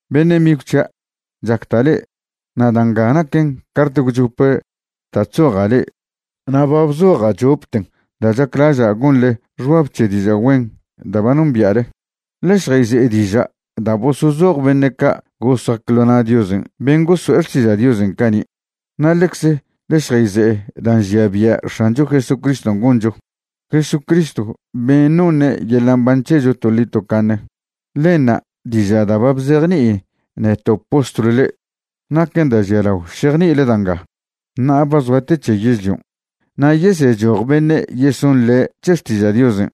Beṉe' migw c̱hia', chacda' le'e, na' da' nga naquen cart gwchope da' chzoja' le'e. Na' ba bzoja' chopten da' chaclaža' gonḻe xbab c̱he diža' güen da' ba nombia'le. Ḻe šjayze'e diža' da' bosozoj beṉe' ca' gosac ḻo na' Diosen' ben' goso'e xtižen' cani'. Na' ḻecze ḻe šjayze'e dan' nžia bia' X̱ancho Jesucriston' goncho, Jesucristw ben' noṉe' yeḻa' mban c̱hecho toḻi tocaṉe. Ḻenṉa' diža' da' ba bzejni'i neto' postlw le'e. Naquen da' žialao šejni'ile da' nga. Ṉa'a ba zoa te c̱he yežlion', na' yesechoj beṉe' yesonḻe' c̱he xtiža' Diosen'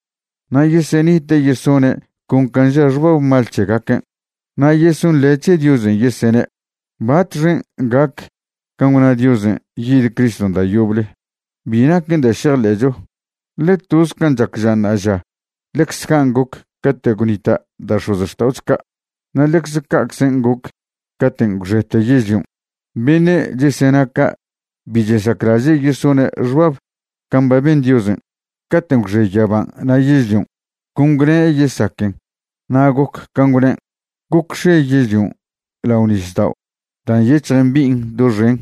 na' yesenite' yesone' con can' ža xbab mal c̱hegaquen'. Na' yesonḻe' c̱he Diosen' yesene': “¿Batxen' gac can' gwna Diosen' yid Criston' da' yoble? Bi naquen da' šejḻe'cho, ḻe toz can' chac ža ṉa'aža ḻecze can' goc cate' gwnita' da' x̱ozxta'ocho ca', na' ḻecze ca'czen' goc caten' gwxete yežlion'.” Beṉe' chesena ca' bi chesaclaže' yesone' xbab can' ba ben Diosen'. Caten' gwxe yaban' na' yežlion', con gwne' yesaquen na' goc can' gwnen'. Gocx̱e yežlion' lao nisdao' da' nyec̱hj mbi'in doxen,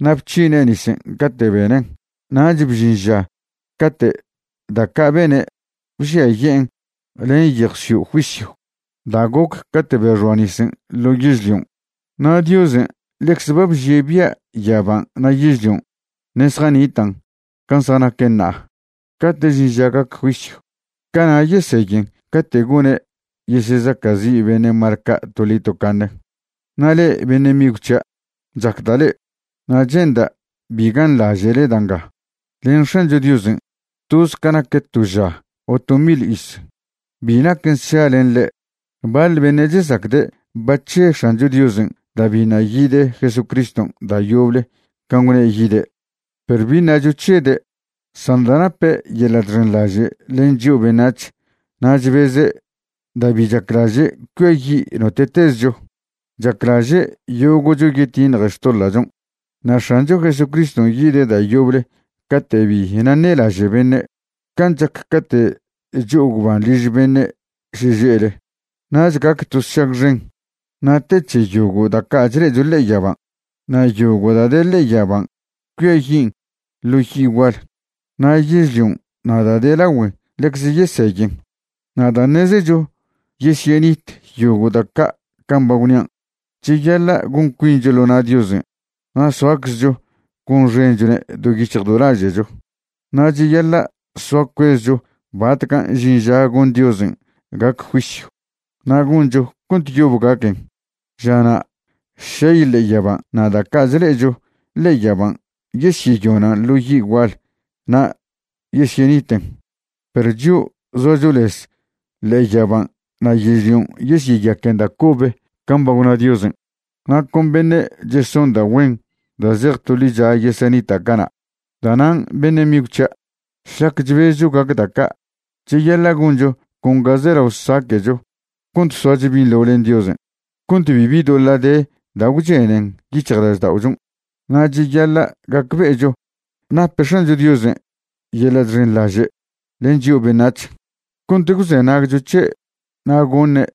na' bc̱hine' nisen' cate' benen'. Nach bžin ža cate' da' ca' bene' bžiaye'en len yejw sio' juisyw da' goc cate' bexoa nisen' ḻo yežlion'. Na' Diosen' ḻecze ba bžie' bia' yaban' na' yežlion' ṉe' zjanitan' can' zjanaquen ṉa'a cate' žin ža gac juisyw. Cana' yeseyen cate' gone' yesezaca'zi' beṉe' mal ca' toḻi tocaṉe. Na' le'e beṉe' migw c̱hia', chacda' le'e, na' che'nda' bi ganḻaže'le da' nga, len X̱ancho Diosen' toz ca nac to ža o to mil iz, bi naquen sša len ḻe'. Baḻ beṉe' chesacde' ba chže X̱ancho Diosen' da' biṉa' yid Jesucriston' da' yoble can' gwne' yide'. Perw bi ṉacho chžede', san da' nape' yeḻa' chxenḻaže' len chio' beṉac̱h na' chbeze' da' bi chaclaže' cuiayi' note'tezcho. Chaclaže' yogo'cho yetiṉje xtoḻa'chon'. Na' X̱ancho Jesucriston' yide' da' yoble cate' bi naṉe'laže' beṉe', can' chac cate' cho'o gwban liž beṉe' šeže'le. Nach gac to sšag xen, na' te c̱he yogo' da' ca' chle'echo ḻe'e yaban', na' yogo' da' de ḻe'e yaban' cuiayin' ḻo yi' gual, na' yežlion' na' da' de lagüen ḻecze yeseyen. Na' da' ṉezecho yesyenit yogo' da' ca' can' ba gwnia', cheyaḻa' gon cuincho ḻo na' Diosen' na' soaczcho gonxenchone' do yic̱hj do laže'cho. Na' cheyaḻa' soa cuezcho batcan' žin ža gon Diosen' gac juisyw, na' goncho cont yob gaquen. Žana' šey ḻe'e yaban' na' da' ca' chḻe'echo ḻe'e yaban' yesyeyonan' ḻo yi' gual na' yesyeniten. Perw chio' zoacho lez ḻe'e yaban' na' yežlion' yesyeyaquen da' cobe can' ba gwna Diosen', na' con beṉe' cheson da' güen da' zej to ḻicha yesenita' cana'. Da'nan' beṉe' migw c̱hia', šlac chbezcho gac da' ca', cheyaḻa' goncho con ga zelao saque'cho cont soacho binḻo len Diosen' cont bibi doḻa' de da' gwchenen yic̱hjlažda'ochon'. Na' cheyaḻa' gacbe'echo nape X̱ancho Diosen' yeḻa' chxenḻaže' len chio' beṉac̱h cont gwzenagcho c̱he' na' goṉe'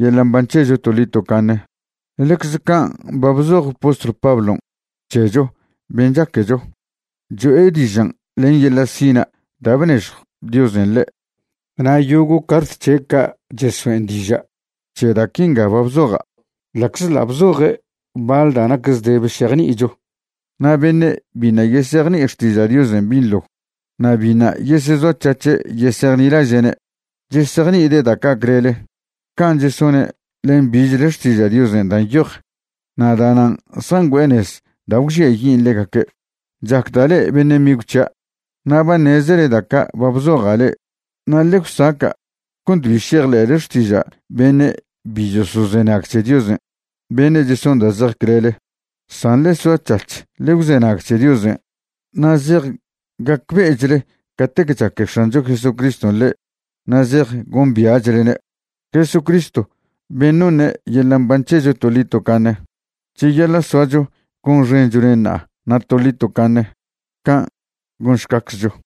yeḻa' mban c̱hecho toḻi tocaṉe. Ḻecze can' ba bzoj postlw Pablon' c̱hecho ben' chaquecho, cho'e dižan' len yeḻa' sina' da' bnežjw Diosen' ḻe'. Na' yogo' cart c̱he' ca' chesoen' diža' c̱he da' quinga ba bzoja', ḻa'czḻa' bzoje' baḻ da' nac zdebe šejni'icho. Na' beṉe' biṉa' yesejni'i xtiža' Diosen' binḻo na' biṉa' yesezoac̱hac̱he' yesejnilaže'ne' chesejni'ide' da' ca' clele, can' chesone' len bichle Xtiža' Diosen' da' nyoj, na' da'nan' zjangüe'e nez da' gwžiayin' ḻegaque'. Chacda' le'e beṉe' migw c̱hia', na' ba ṉezele da' ca' ba bzoja' le'e. Na' ḻe gwsaca' cont bi šejḻe'le xtiža' beṉe' bi chosozenag c̱he Diosen', beṉe' cheson da' zej clele, san ḻe soac̱hac̱h ḻe gwzenag c̱he Diosen'. Na' zej gacbe'echle catec chaque X̱ancho Jesucriston' le'e na' zej gombia'chlne', Jesucristw ben' noṉe' yeḻa' mban c̱hecho toḻi tocaṉe. Cheyaḻa' soacho gonxenchwne' ṉa'a na' toḻi tocaṉe. Can' gonšcaczcho.